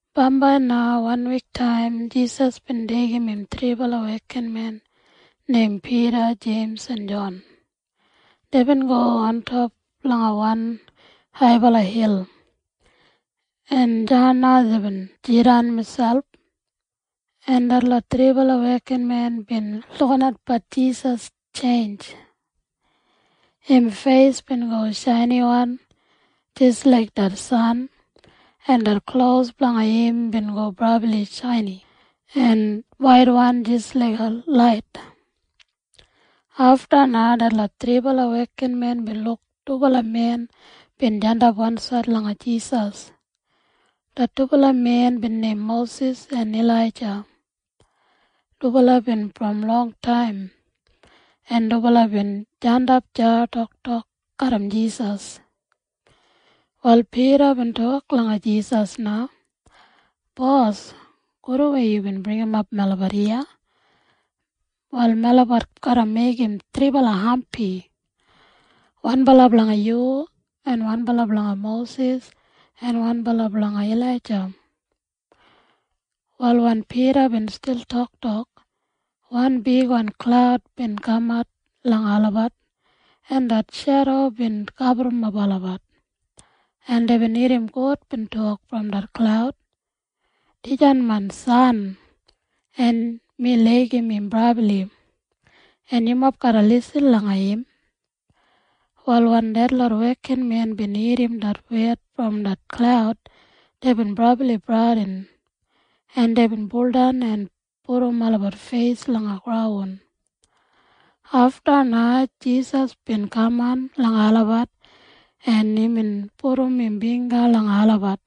Bambai na wanwiktaim Jisas bin deigim im thribala wekinmen neim Pida, Jeims en Jon. Deibin go ontop langa wan haibala hil, en deya na deibin jidan miselp, en detlot thribala wekinmen bin lukinatbat Jisas tjeinj. Im feis bin go shainiwan jis laik det san, en det klos blanga im bin go brabli shaini en waitwan jis laiga lait. Afta na detlot thribala wekinmen bin luk dubala men bin jandap wansaid langa Jisas. Det dubala men bin neim Mosis en Ilaija. Dubala bin brom longtaim, en dubala bin jandap deya toktok garram Jisas. Wal Pida bin tok langa Jisas na, “Bos, gudwan yubin bringimap melabat iya. Wal melabat garra meigim thribala hampi, wanbala blanga yu en wanbala blanga Mosis en wanbala blanga Ilaija.” Wal wen Pida bin stil toktok, wan bigwan klaud bin kamat langa olabat, en det shedo bin gaburrumap olabat, en deibin irrim God bin tok brom det klaud, “Dijan main San, en mi laigim im brabli, en yumob garra lisin langa im.” Wal wen detlot wekinmen bin irrim det wed brom det klaud, deibin brabli bradin, en deibin tjakam miselp feisdan langa graun. Afta na Jisas bin kaman langa olabat, en imbin pudum im bingga langa olabat,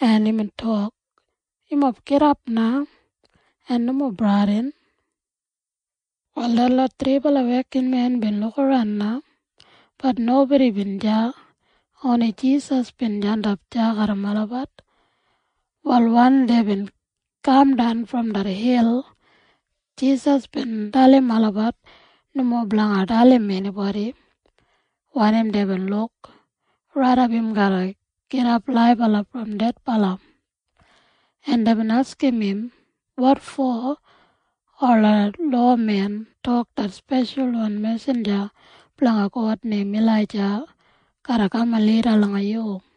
en imbin tok, “Yumob gidap na, en nomo bradin.” Wal detlot thribala wekinmen bin lukaran na. Bat nobodi bin deya. Oni Jisas bin jandap deya garram olabat. Wal wen deibin kamdan brom det hil, Jisas bin dalim olabat nomo blanga dalim enibodi wanim deibin luk raidap im garra gidap laibala brom dedbala. En deibin askim im, “Wotfo ola lowamen tok det speshalwan mesinja blanga God neim Ilaija garra kaman lida langa yu?”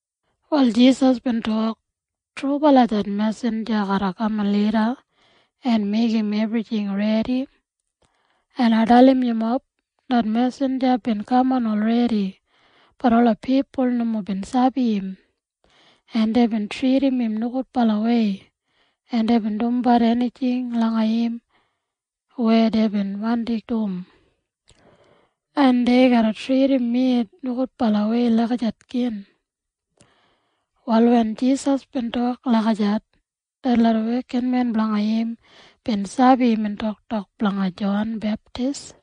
Wal Jisas bin tok, “Trubala det mesinja garra kaman lida en meigim ebrijing redi. En ai dalim yumob. Det mesinja bin kaman olredi. Bat ola pipul nomo bin sabi im, en deibin tridim im nogudbalawei, en deibin dumbat enijing langa im weya deibin wandi dum. En dei garra tridim mi nogudbalawei lagijat gin.” Wal wen Jisas bin tok lagijat, detlot wekinmen blanga im bin sabi imbin toktok blanga Jon Beptis.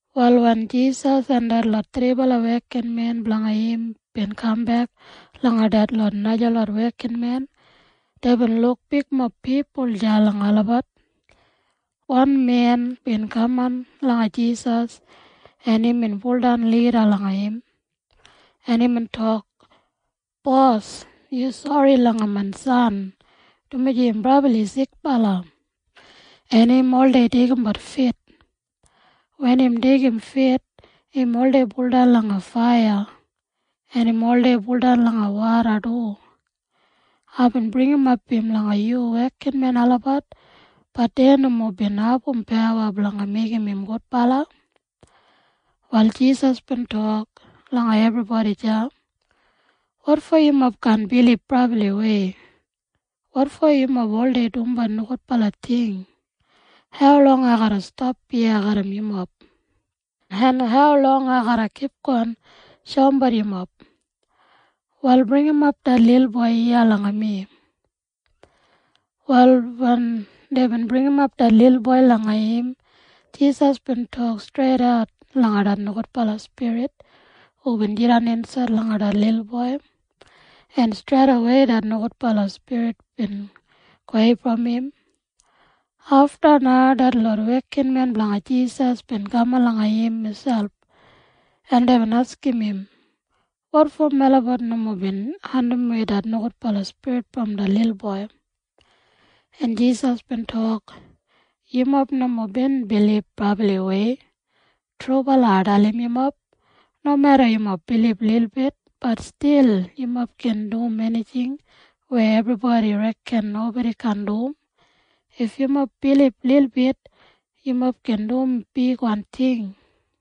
Wal wen Jisas en detlot thribala wekinmen blanga im bin kambek langa detlot najalot wekinmen, deibin luk bigmob pipul deya langa olabat. Wan men bin kaman langa Jisas, en imbin baudan lida langa im, en imbin tok, “Bos, yu sori langa main san, dumaji im brabli sikbala, en im oldei deigimbat fit. Wen im deigim fit, im oldei buldan langa faiya, en im oldei buldan langa woda du. Aibin bringimap im langa yu wekinmen olabat. Bat dei nomo bin abum pawa blanga meigim im gudbala.” Wal Jisas bin tok langa ebribodi deya, “Wotfo yumob kaan bilib brabliwei? Wotfo yumob oldei dumbat nogudbala ting? Haulong ai garra stap iya garram yumob? En haulong ai garra kipgon shoumbat yumob? Wal bringimap det lilboi iya langa mi.” Wal wen deibin bringimap det lilboi langa im, Jisas bin tok streidat langa det nogudbala spirit hubin jidan insaid langa det lilboi, en streidawei det nogudbala spirit bin gowei brom im. Afta na detlot wekinmen blanga Jisas bin kaman langa im miselp, en deibin askim im, “Wotfo melabat nomo bin andimwei det nogudbala spirit brom det lilboi?” En Jisas bin tok, “Yumob nomo bin bilib brabliwei. Trubala ai dalim yumob. Nomeda yumob bilib lilbit, bat stil yumob gin dum enijing weya ebribodi reken nobodi kaan dum. If yumob bilib lilbit, yumob gin dum bigwan ting.”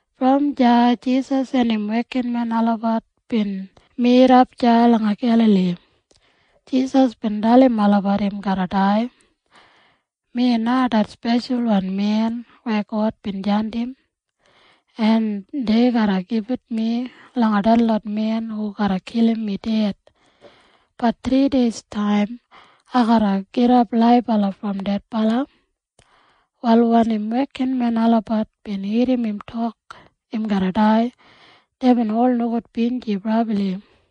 Brom deya Jisas en im wekinmen olabat bin midap deya langa Gelali. Jisas bin dalim olabat im garra dai, “Mi na det Speshalwan Men weya God bin jandim, en dei garra gibit mi langa detlot men hu garra kilim mi ded. Bat thrideistaim ai garra gidap laibala brom dedbala.” Wal wen im wekinmen olabat bin irrim im tok im garra dai, deibin ol nogudbinji brabli.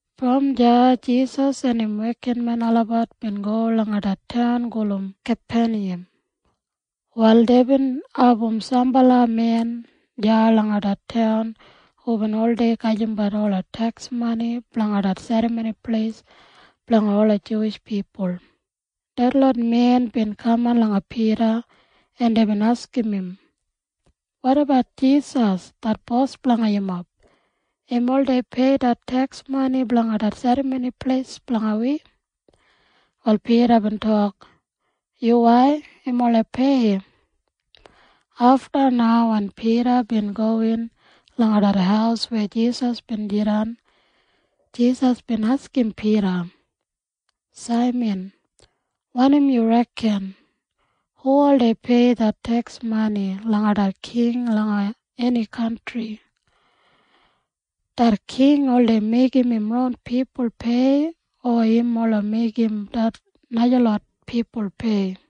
Brom deya Jisas en im wekinmen olabat bin go langa det taun gulum Kapeniyam. Wal deibin abum sambala men deya langa det taun hubin oldei gajimbat ola teks mani blanga det Serramoni Pleis blanga ola Juwish pipul. Detlot men bin kaman langa Pida, en deibin askim im, “Wotabat Jisas det Bos blanga yumob? Im oldei pei det teks mani blanga det serramoni pleis blanga wi?” Wal Pida bin tok, “Yuwai, im oldei pei.” Afta na wen Pida bin gowin langa det haus weya Jisas bin jidan, Jisas bin askim Pida, “Saiman, wanim yu reken? Hu oldei pei det teks mani langa det king langa eni kantri? Det king oldei meigim im ron pipul pei o im meigim ola najalot pipul pei?”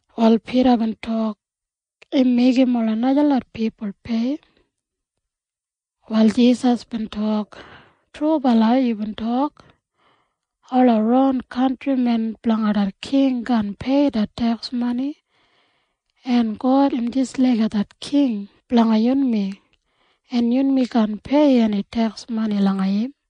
Wal Pida bin tok, “Im meigim ola najalot pipul pei.” Wal Jisas bin tok, “Trubala yubin tok. Ola ron kantrimen blanga det king kaan pei det teks mani. En God im jis laiga king blanga yunmi, en yunmi kaan pei eni teks mani langa im.